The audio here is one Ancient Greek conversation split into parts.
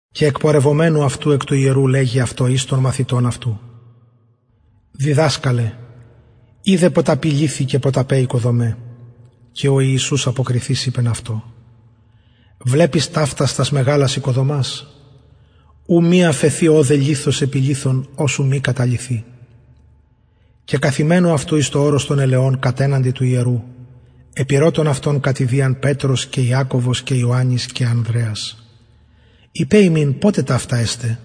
και εκπορευομενου αυτου εκ του ιερου λεγει αυτω εις των μαθητων αυτου διδασκαλε ιδε ποταποι λιθοι και ποταπαι οικοδομαι και ο ιησους αποκριθεις ειπεν αυτω βλεπεις ταυτας τας μεγαλας οικοδομας ου μη αφεθη λιθος επι λιθω ος ου μη καταλυθη και καθημενου αυτου εις το ορος των ελαιων κατεναντι του ιερου επηρωτων αυτον κατ ιδιαν πετρος και ιακωβος και ιωαννης και ανδρεας ειπε ημιν ποτε ταυτα εσται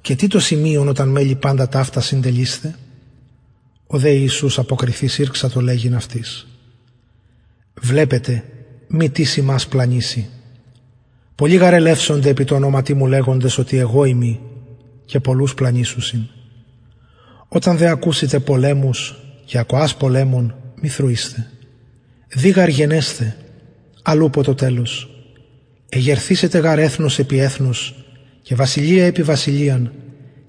και τι το σημειον οταν μελλη παντα ταυτα συντελεισθαι ο δε ιησους αποκριθεις αυτοις ηρξατο λεγειν βλεπετε μη τις υμας πλανηση πολλοι γαρ ελευσονται επι τω ονοματι μου λεγοντες οτι εγω ειμι και πολλους πλανησουσιν οταν δε ακουσητε πολεμους και ακοας πολεμων μη θροεισθε δει γαρ γενεσθαι αλλ ουπω το τελος εγερθησεται γαρ εθνος επι εθνος και βασιλεια επι βασιλειαν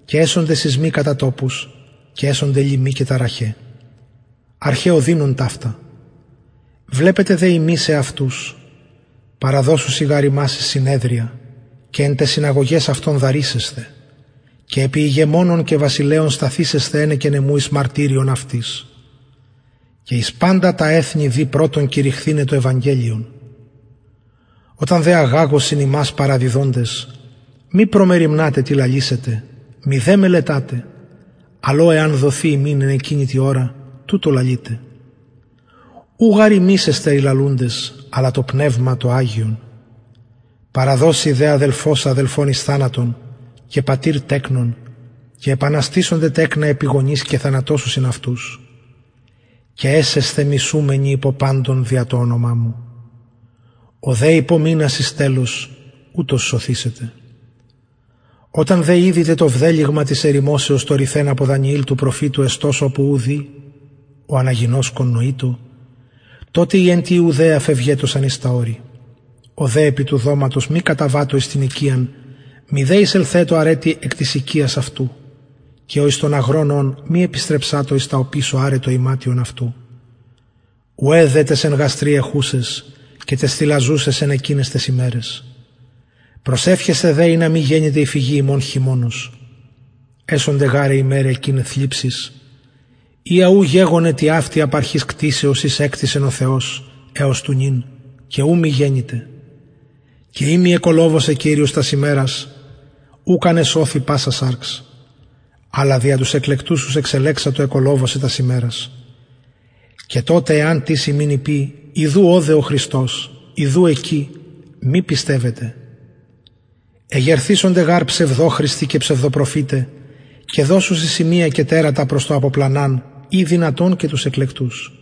και εσονται σεισμοι κατα τοπους και εσονται λιμοι και ταραχαι αρχαι ωδινων ταυτα βλεπετε δε υμεις εαυτους παραδωσουσιν γαρ υμας εις συνεδρια και εις συναγωγας δαρησεσθε και επι ηγεμονων και βασιλεων σταθησεσθε ενεκεν εμου εις μαρτυριον αυτοις και εις παντα τα εθνη δει πρωτον κηρυχθηναι το ευαγγελιον οταν δε αγαγωσιν υμας παραδιδοντες μη προμεριμνατε τι λαλησητε μηδε μελετατε αλλ ο εαν δοθη υμιν εν εκεινη τη ωρα τουτο λαλειτε ου γαρ εστε υμεις οι λαλουντες αλλα το πνευμα το αγιον παραδωσει δε αδελφος αδελφον εις θανατον και πατηρ τεκνον και επαναστησονται τεκνα επι γονεις και θανατωσουσιν αυτους και εσεσθε μισουμενοι υπο παντων δια το ονομα μου ο δε υπομεινας εις τελος ουτος σωθησεται οταν δε ιδητε το βδελυγμα της ερημωσεως το ρηθεν υπο δανιηλ του προφητου εστως οπου ου δει ο αναγινωσκων νοειτω τοτε οι εν τη ιουδαια φευγετωσαν εις τα ορη ο δε επι του δωματος μη καταβατω εις την οικιαν μηδε εισελθετω αραι τι εκ της οικιας αυτου και ο εις τον αγρον ων μη επιστρεψατω εις τα οπισω αραι το ιματιον αυτου ουαι δε ταις εν γαστρι εχουσαις και ταις θηλαζουσαις εν εκειναις ταις ημεραις προσευχεσθε δε ινα μη γενηται η φυγη υμων χειμωνος εσονται γαρ αι ημεραι εκειναι θλιψις οια ου γεγονεν τοιαυτη απ αρχης κτισεως ης εκτισεν ο θεος εως του νυν και ου μη γενηται και ει μη κυριος εκολοβωσεν τας ημερας ουκ αν εσωθη πασα σαρξ αλλα δια τους εκλεκτους ους εξελεξατο εκολοβωσεν τας ημερας τοτε εαν τις υμιν ειπη ιδου ωδε ο χριστος η ιδου εκει μη πιστευετε εγερθησονται γαρ ψευδοχριστοι και ψευδοπροφηται και δωσουσιν σημεια και τερατα προς το αποπλαναν ει δυνατον και τους εκλεκτους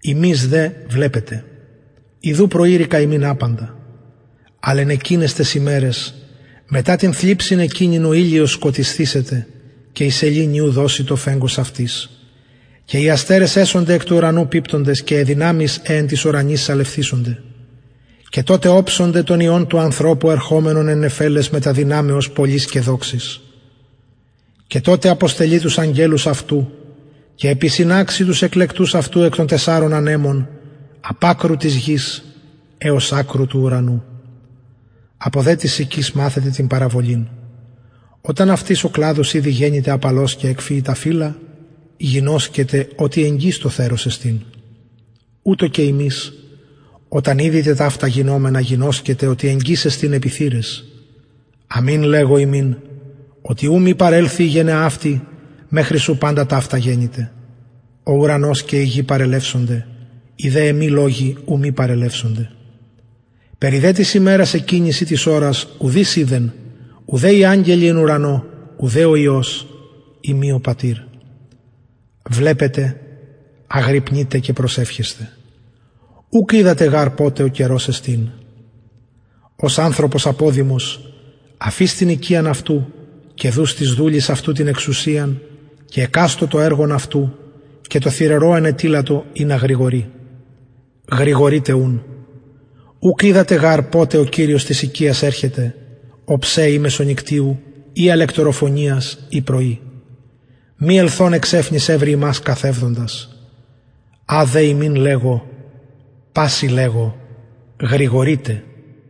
υμεις δε βλεπετε ιδου προειρηκα υμιν παντα αλλ εν εκειναις ταις ημεραις μετα την θλιψιν εκεινην ο ηλιος σκοτισθησεται και η σεληνη ου δωσει το φεγγος αυτης και οι αστερες του ουρανου εσονται εκπιπτοντες και αι δυναμεις αι εν τοις ουρανοις σαλευθησονται και τοτε οψονται τον υιον του ανθρωπου ερχομενον εν νεφελαις μετα δυναμεως πολλης και δοξης και τοτε αποστελει τους αγγελους αυτου και επισυναξει τους εκλεκτους αυτου εκ των τεσσαρων ανεμων απ ακρου γης εως ακρου ουρανου απο δε της συκης μαθετε την παραβολην οταν αυτης ηδη ο κλαδος απαλος γενηται και εκφυη τα φυλλα γινωσκετε οτι εγγυς το θερος εστιν ουτως και υμεις οταν ταυτα ιδητε γινομενα γινωσκετε οτι εγγυς εστιν επι θυραις αμην λεγω υμιν οτι ου μη παρελθη η γενεα αυτη μεχρι ου παντα ταυτα γενηται ο ουρανος και η γη παρελευσεται οι δε λογοι μου ου μη παρελθωσιν περι δε της ημερας εκεινης η ωρας ουδεις οιδεν ουδε οι αγγελοι οι εν ουρανω ουδε ο υιος ει μη ο πατηρ βλεπετε αγρυπνειτε και προσευχεσθε ουκ οιδατε γαρ ποτε ο καιρος εστιν ως ανθρωπος αποδημος αφεις την οικιαν αυτου και δους τοις δουλοις αυτου την εξουσιαν και εκαστω το εργον αυτου και τω θυρωρω ενετειλατο ινα γρηγορη γρηγορειτε ουν ουκ οιδατε γαρ ποτε ο κυριος της οικιας ερχεται οψε η μεσονυκτιου η αλεκτοροφωνιας η πρωι μη ελθων εξαιφνης ευρη υμας καθευδοντας α δε υμιν λεγω πασιν λεγω γρηγορειτε